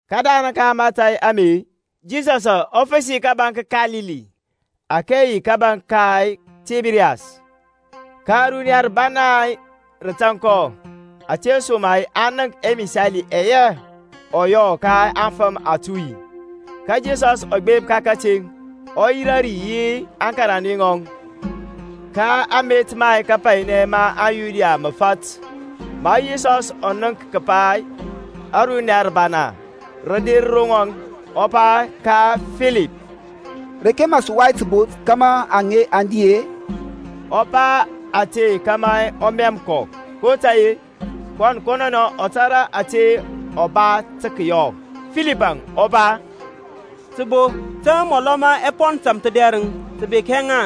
Kədarəŋ ka mȧtȧy ame-e, Yisɔsȧŋ ɔ fəsi kȧbȧŋ ka Kalili, ȧke yi kȧbȧŋ ka Tiberias. Ka runiya rəbana rə tȧŋ kɔ, ȧtesoma-e aŋ nənk ɛmisali ɛyɛ ɔ yɔ ka aŋfəm atuy. Ka Yisɔsȧŋ ɔ gbep ka kəteŋ, ɔ yirȧ ri yi aŋkarande ŋɔŋ. Ka amet ma kapainɛ ma aŋYuda mə fat. Ma Yisɔsȧŋ ɔ nənk kəpa runiya rəbana rə der ro ŋɔŋ-e, ɔ pa ka Filip, Reke mə sə wai təbo kȧmȧ aŋe aŋ di-e? Ɔ pa ȧte kȧmȧ ɔ mɛm kɔ, kotȧy-e kɔn kɔnɔnɛ tȧrȧ ȧte ɔ ba tə kəyɔ. Filipȧŋ ɔ pa, Təbo ta mɔlɔ ma ɛpɔn tȧmthədɛrəŋ tə bek hɛ ŋa,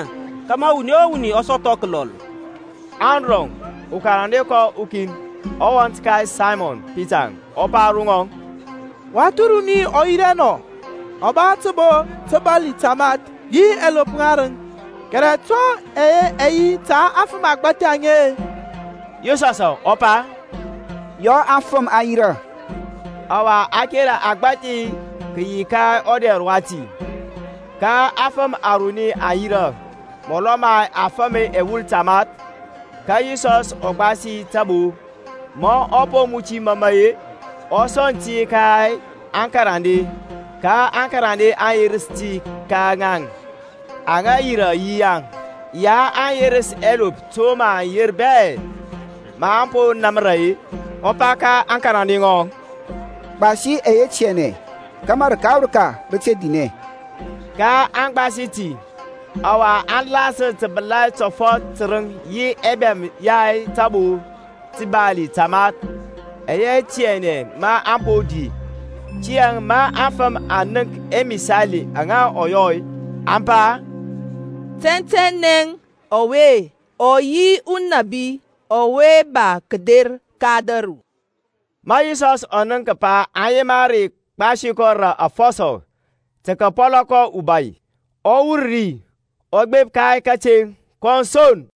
kȧmȧ wuni o wuni ɔ sɔthɔ kəlɔl. Andrɔŋ, ukarande kɔŋ ukin, wɔnt ka Saymɔn Pita, ɔ pa ro ŋɔŋ, Wath runi ɔ yi rɛ nɔ, ɔ ba təbo təbarli tamath, yi ɛlop ŋarəŋ: kɛrɛ to ɛye ɛ yi ta aŋfəm agbȧthi aŋe-e? Yisɔsȧŋ ɔ pa, Yɔ aŋfəm aŋ yirȧ. Ɔwa kereŋ kəgbȧthi kə yi ka ɔdɛr wati. Ka aŋfəm aruni aŋ yirȧ, mɔlɔ ma afəm ɛwul tamath. Ka Yisɔsȧŋ ɔ gbasi tabo; ma ɔ po muti məmə-e, ɔ sɔŋ ti ka aŋkarande, ka aŋkarande aŋ yerəs ti ka ŋaŋ aŋa yirȧ yirȧ; ya a yerəs ɛlop to aŋ yema bɛ. Maŋ po namra-e, ɔ pa ka aŋkarande ŋɔŋ, gbasi ɛyɛ tianɛ kȧmȧ rəka o rəka rə te dinɛ. kaŋ gbas gbas ti, ɔwa aŋ lasər təbəlai tɔfɔt tərəŋ yi ɛbɛm ya tabo təbarli tamath ɛyɛ tianɛ maŋ po di. Tiyȧŋ ma aŋfəm aŋ nənk ȧŋmisali aŋa ɔ yɔ-e, aŋ pa, Tɛntɛnɛ ɔwe ɔ yi ɔnȧbi ɔwe ba kəder ka ȧdȧru. Ma Yisɔsȧŋ ɔ nənk kəpa aŋ yema re gbasi kɔ rə afɔsɔ, tə kəpɔlɔ kɔ ubai-e, ɔ wur ri ɔ gbep ka kateŋ kɔn son.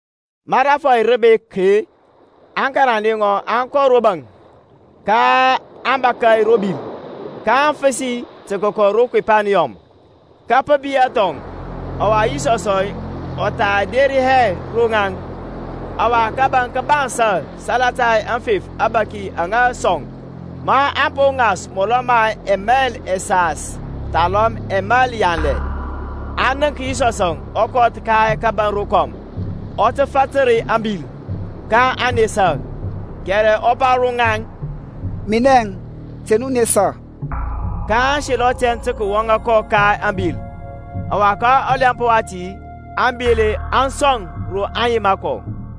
Ma rȧfɔy rə bek-e, aŋkarande ŋɔŋ aŋ kɔ ro baŋ; kaŋ bȧkȧ ro bil, kaŋ fəsi tə kəkɔ ro Kepaniyɔm. Ka pə biyȧ thɔŋ, ɔwa Yisɔsȧŋ ɔ tha der hɛ ro ŋaŋ. Ɔwa kȧbȧŋ kə bansȧ salata aŋfef abȧki aŋa sɔŋ. Maŋ po ŋas mɔlɔ ma ɛmail ɛsas thalɔm ɛmail yanlɛ, aŋ nənk Yisɔsȧŋ ɔ kɔth ka kȧbȧŋ rokɔm, ɔ tə fatər ȧŋbil: kaŋ nesa. Kɛrɛ ɔ pa ro ŋaŋ, Minɛŋ; te nu nesa. kaŋ selɔ tɛn tə kəwɔŋa kɔ ka ȧŋbil; ɔwa ka ɔlɛmp wati ȧŋbil aŋ sɔ ro aŋ yema kɔ.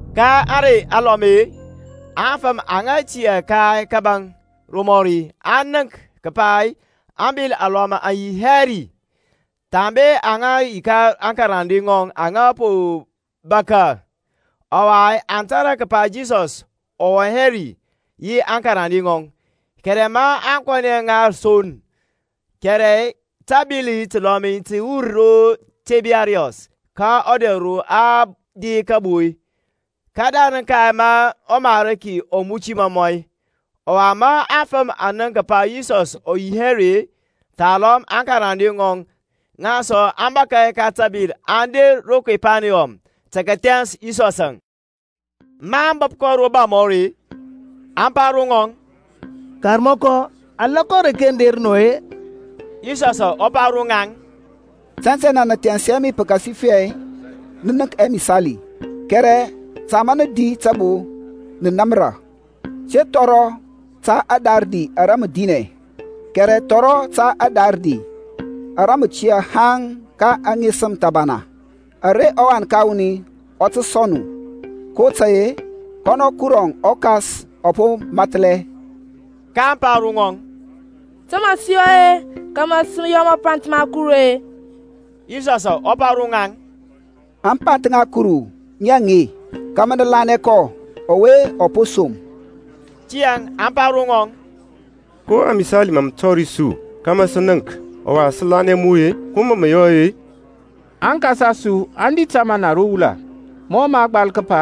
Ka ȧŋrey alɔm-e, aŋfəm aŋa tiyȧ ka kȧbȧŋ romɔri aŋ nənk kəpa abil alɔm aŋ yi hɛ ri, thambe aŋa ro aŋkarande ŋɔŋ aŋ po bȧkȧ, ɔwa aŋ tȧrȧ kəpa Yisɔsȧŋ ɔ wɔŋ hɛ yi aŋkarande ŋɔŋ, kɛrɛ ŋaŋ aŋ kɔnɛ ŋa son, (kɛrɛ təbil təlɔl tə wur ro Tiberias ka ɔdɛr ro aŋ di kabo-e, kədarəŋ ka ma ɔMarki ɔ muti mɔmɔ). Ɔwa ma aŋfəm aŋ nənk kəpa Yisɔs ɔ yi hɛ ri, thalɔm aŋkarande ŋɔŋ, ŋaŋ sɔ aŋ bȧkȧ ka təbil aŋ der ro Kepaniyɔm, tə kəthɛns Yisɔsȧŋ. Maŋ bəp kɔ ro baŋ mɔri-e, aŋ pa ro ŋɔŋ, Karmɔkɔ, alɔkɔ areke mə der nɔ-e? Yisɔsȧŋ ɔ pa ro ŋaŋ, Tɛntɛnɛ, nə thɛns hɛ mi pəkasifɛ nə nənk ɛmisali, kɛrɛ ta ma nə di tabo, nə namra. Te thɔrɔ ta adarədi ara mə dinɛ, kɛrɛ thɔrɔ ta ȧdarədi ara mə tiyȧ haŋ ka aŋesəm thəbana, ara ɔWan ka wuni ɔ tə sɔŋ nu: kotȧy-e kɔnɔ Kuru ɔKas ɔ po mathlɛ. kaŋ pa ro ŋɔŋ, To mə sə yɔ-e, kȧmȧ sə yɔ mapanth ma Kuru-e? Yisɔsȧŋ ɔ pa ro ŋaŋ, Ȧŋpanth ŋa Kuru ŋi aŋe, kȧmȧ nə lanɛ kɔ ɔwe ɔ po som. Tiyȧŋ aŋ pa ro ŋɔŋ, Ko amisali mȧ mə tɔri su, kȧmȧ sə nənk, ɔwa sə lanɛ mu-e? Ko mȧ mə yɔ-e? Aŋkas a su aŋ di tamana ro wula: mɔ mə a gbal kəpa,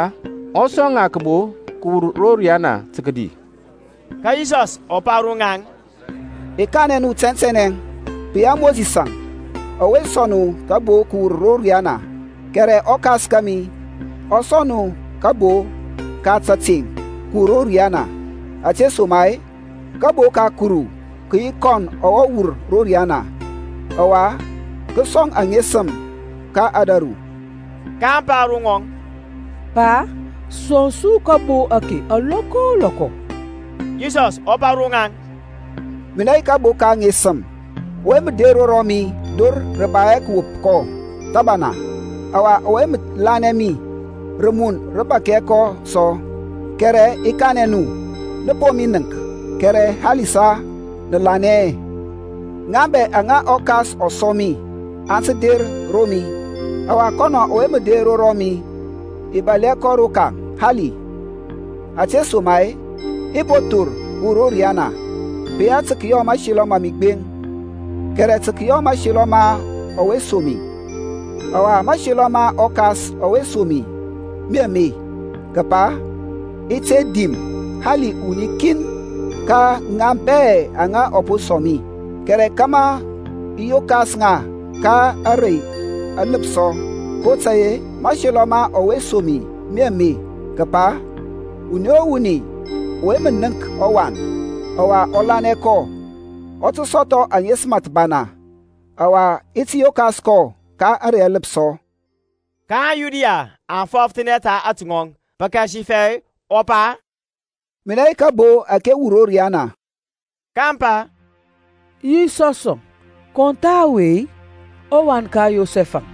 Ɔ sɔŋ ŋa kəbo kəwur ro riyana tə kədi. Ka Yisɔsȧŋ ɔ pa ro ŋaŋ, I kanɛ nu tɛntɛnɛ, pə yi hɛ Mosisȧŋ ɔwe sɔŋ nu kəbo kəwur ro riyana; kɛrɛ ɔKas kȧmi ɔ sɔŋ nu kabo ka tȧteŋ kəwur ro riyana. Ȧtesoma-e kabo ka Kuru kə yi kɔn ɔwe wur ro riyana, ɔwa kə sɔŋ aŋesəm ka ȧdȧru. kaŋ pa ro ŋɔŋ, Pa, sɔŋ su kabo ake alɔkɔ o lɔkɔ. Yisɔsȧŋ ɔ pa ro ŋaŋ, Minɛ yi kabo ka aŋesəm: ɔwe mə der ro mi dor rə ba hɛ kəwop kɔ thəbana: ɔwa ɔwe mə lanɛ mi rəmun rə bȧk hɛ kɔ sɔ. Kɛrɛ i kanɛ nu, Nə po mi nənk, kɛrɛ halisa nə lanɛ hɛ. Ŋaŋ bɛ aŋa ɔKas ɔ sɔŋ mi aŋ tə der ro mi; ɔwa kɔnɔ ɔwe mə der ro mi i bȧl hɛ kɔ rokaŋ hali. Ȧtesoma-e i po thor kəwur ro riyana, pə yi hɛ tə kəyɔ mȧselɔ ma mi gbeŋ, kɛrɛ tə kəyɔ mȧselɔ ma ɔwe som mi. Ɔwa mȧselɔ ma ɔKas ɔwe som mi mi ame, kəpa i te dim hali ukin ka ŋa bɛ aŋa ɔ po sɔŋ mi, kɛrɛ kȧmȧ i yokas ŋa ka ȧŋrey aləpsɔ. kotȧy-e mȧselɔ ma ɔwe som mi mi ame, kəpa wuni o wuni ɔwe mə nənk ɔWan, ɔwa ɔ lanɛ kɔ, ɔ tə sɔthɔ aŋesəm thəbana, ɔwa i ti yokas kɔ ka ȧŋrey aləpsɔ. Ka aŋYuda aŋ fɔfəthanɛ ta atɔŋ, pəkasifɛ ɔ pa, Minɛ yi kabo ȧke wur ro riyana. kaŋ pa, Yisɔsȧŋ kɔn tha ɔwe, ɔwan ka Yosɛf-əŋ,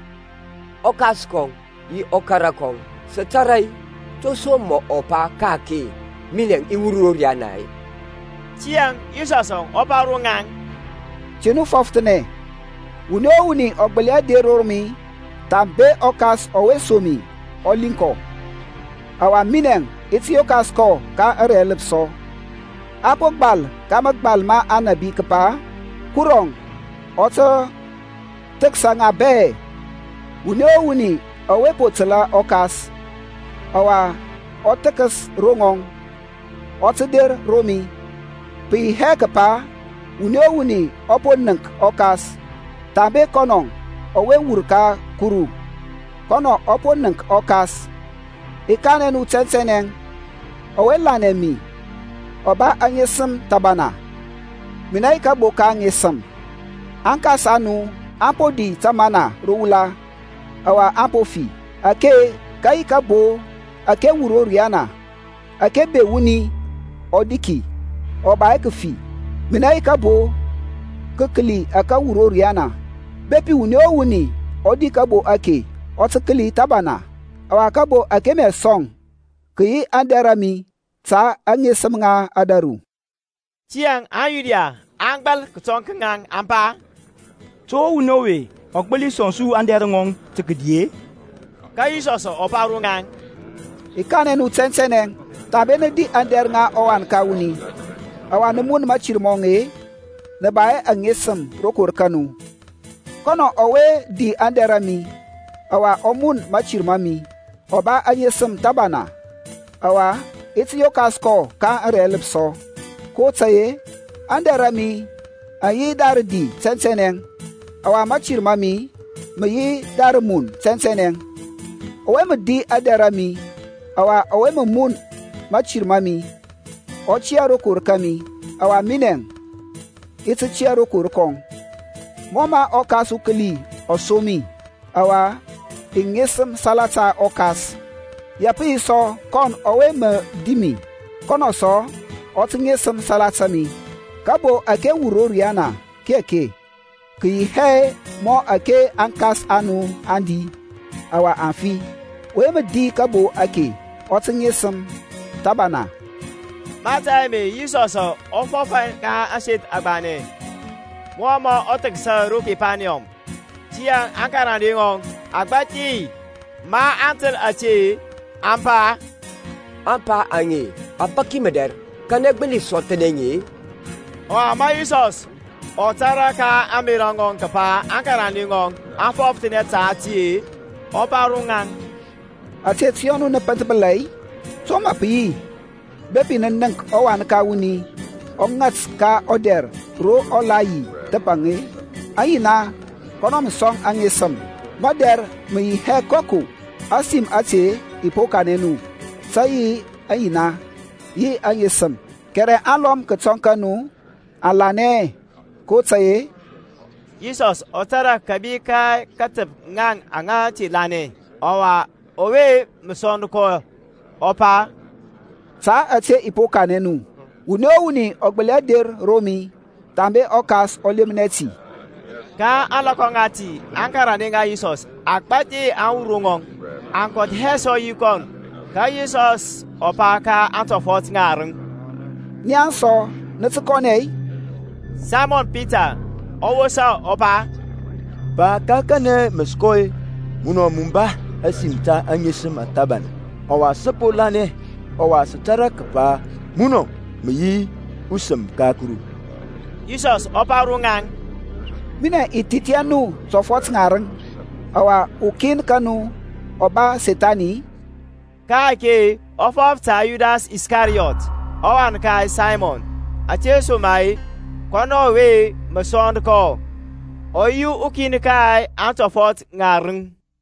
ɔkas kɔŋ yi ɔkara kɔŋ sə tara-e, to som mɔ pa ka-ake, Minɛŋ i wur ro riana-e? Tiyȧŋ Yisɔsȧŋ ɔ pa ro ŋaŋ, Te nu fɔfəthanɛ. Wuni o wuni ɔ gbəli hɛ der ro mi, thambe ɔKas ɔwe som mi ɔ liŋ kɔ; ɔwa minɛŋ i ti yokas kɔ ka ȧŋrey aləpsɔ. A po gbal ka mȧgbal ma Aŋnȧbi kəpa, Kurɔŋ ɔ tə thəksa ŋa bɛ. Wuni o wuni ɔwe po təlȧ ɔKas, ɔwa ɔ thəkəs ro ŋɔŋ, ɔ tə der ro mi. Pə yi hɛ kəpa wuni o wuni ɔ po nənk ɔKas, thambe kɔnɔ ɔwe wur ka Kuru, kɔnɔ ɔ po nənk ɔKas. I kanɛ nu tɛntɛnɛ, Ɔwe lanɛ mi ɔ ba aŋesəm thəbana. Minɛ yi kabo ka aŋesəm. Aŋkas a nu aŋ po di tamana ro wula, ɔwa aŋ po fi. Ake ka yi kabo ȧke wur ro riyana, ȧke be wuni ɔ di ki, ɔ ba hɛ kəfi. Minɛ yi kabo kəkəli ȧke wur ro riyana; bepi wuni o wuni ɔ di kabo ake, ɔ tə kəli thəbana: ɔwa kabo ȧke mə i sɔŋ kə yi aŋdɛr a mi, ta aŋesəm ŋa ȧdȧru. Tiyȧŋ aŋYuda aŋ gbal kətɔŋ ka ŋaŋ, aŋ pa, To ɔwuni ɔwe ɔ gbəli sɔŋ su aŋdɛr ŋɔŋ tə kədi-e? Ka Yisɔsȧŋ ɔ pa ro ŋaŋ, I kanɛ nu tɛntɛnɛ, Thambe nə di aŋdɛr ŋa ɔWan ka wuni, ɔwa nə mun mȧtir mɔŋ-e, nə ba hɛ aŋesəm rokor ka nu. Kɔnɔ ɔwe mə di aŋdɛr a mi, ɔwa ɔ mun mȧtir ma mi, ɔ ba aŋesəm thəbana, ɔwa i ti yokas kɔ ka ȧŋrey aləpsɔ. kotȧy-e aŋdɛr a mi aŋ yi da rədi tɛntɛnɛ, ɔwa mȧtir ma mi mə yi da rəmun tɛntɛnɛ. Ɔwe mə di aŋdɛr a mi, ɔwa ɔwe mə mun mȧtir ma mi, ɔ tiyȧ rokor kȧmi, ɔwa minɛŋ i ti tiyȧ rokor kɔŋ. Mɔ mə ɔKas ukəli ɔ som mi, ɔwa i ŋesəm salata ɔKas, ya pə yi sɔ kɔn ɔwe mə di mi, kɔnɔ sɔ ɔ tə ŋesəm salata mi. Kabo ȧke wur ro riyana ki ake: kə yi hɛ mɔ ȧke aŋkas a nu aŋ di, ɔwa aŋ fi: ɔwe mə di kabo ake ɔ tə ŋesəm thəbana. Mȧtȧy ame Yisɔsȧŋ ɔ fɔf ka ȧŋseth agbanɛ, mɔ mɔ thəksa ro Kepaniyɔm. Tiyȧŋ aŋkarande ŋɔŋ agbȧthi, maŋ təl ȧte, aŋ pa, Ȧŋpa aŋe a bȧk mədɛr, kanɛ gbəli sɔthnɛ ŋi-e? Ɔwa ma Yisɔsȧŋ ɔ tȧrȧ ka ȧŋmerȧ ŋɔŋ kəpa aŋkarande ŋɔŋ aŋ fɔfəthanɛ ta ti-e, ɔ pa ro ŋaŋ, Ȧte tə yɔ nu nə pənthbəla-i? To mə pə yi bepi nə nənk ɔWan ka wuni ɔ ŋat ka ɔdɛr ro ɔ la yi thəpaŋ-e? Aŋyina kɔnɔ mə sɔŋ aŋesəm; madɛr mə yi hɛ koko: ȧsim ȧte i po kanɛ nu, tə yi ayina, yi ŋesəm. Kɛrɛ alɔm kətɔŋ ka nu aŋ lanɛ hɛ. Kotȧy-e Yisɔsȧŋ ɔ tȧrȧ kȧbi ka katəp ŋaŋ aŋa te lanɛ, ɔwa ɔwe mə sɔnd kɔ. kɔ pa, Ta ȧte i po kanɛ nu, wuni o wuni ɔ gbəli hɛ der ro mi, thambe ɔKas ɔ lemnɛ ti. Ka ȧŋlɔkɔ ŋati aŋkarande ŋa Yisɔs agbȧthi aŋ wur ro ŋɔŋ, aŋ kɔth hɛ sɔ yi kɔnɔŋ. Ka Yisɔsȧŋ ɔ pa ka aŋtɔfɔt ŋarəŋ, Nia sɔ nə tə kɔnɛ-i? Saymɔn Pita ɔ wosa, ɔ pa, Pa ka kanɛ mə sə kɔ-e? Munɔ mə ba ȧsim ta aŋesəm thəbana. Ɔwa sə po lanɛ ɔwa sə tȧrȧ kəpa munɔŋ mə yi ɔSəm ka Kuru. Yisɔsȧŋ ɔ pa ro ŋaŋ, Minɛŋ i thith hɛ nu tɔfɔt ŋarəŋ, ɔwa ukin ka nu ɔ ba Sethani-i? Ka-ake ɔ fɔf ta Yudas Iskariyɔt ɔwan ka Saymɔn: ȧtesoma-e, kɔnɔ yi ɔwe mə sɔnd kɔ, ɔ yi ukin ka antɔfɔt ŋarəŋ.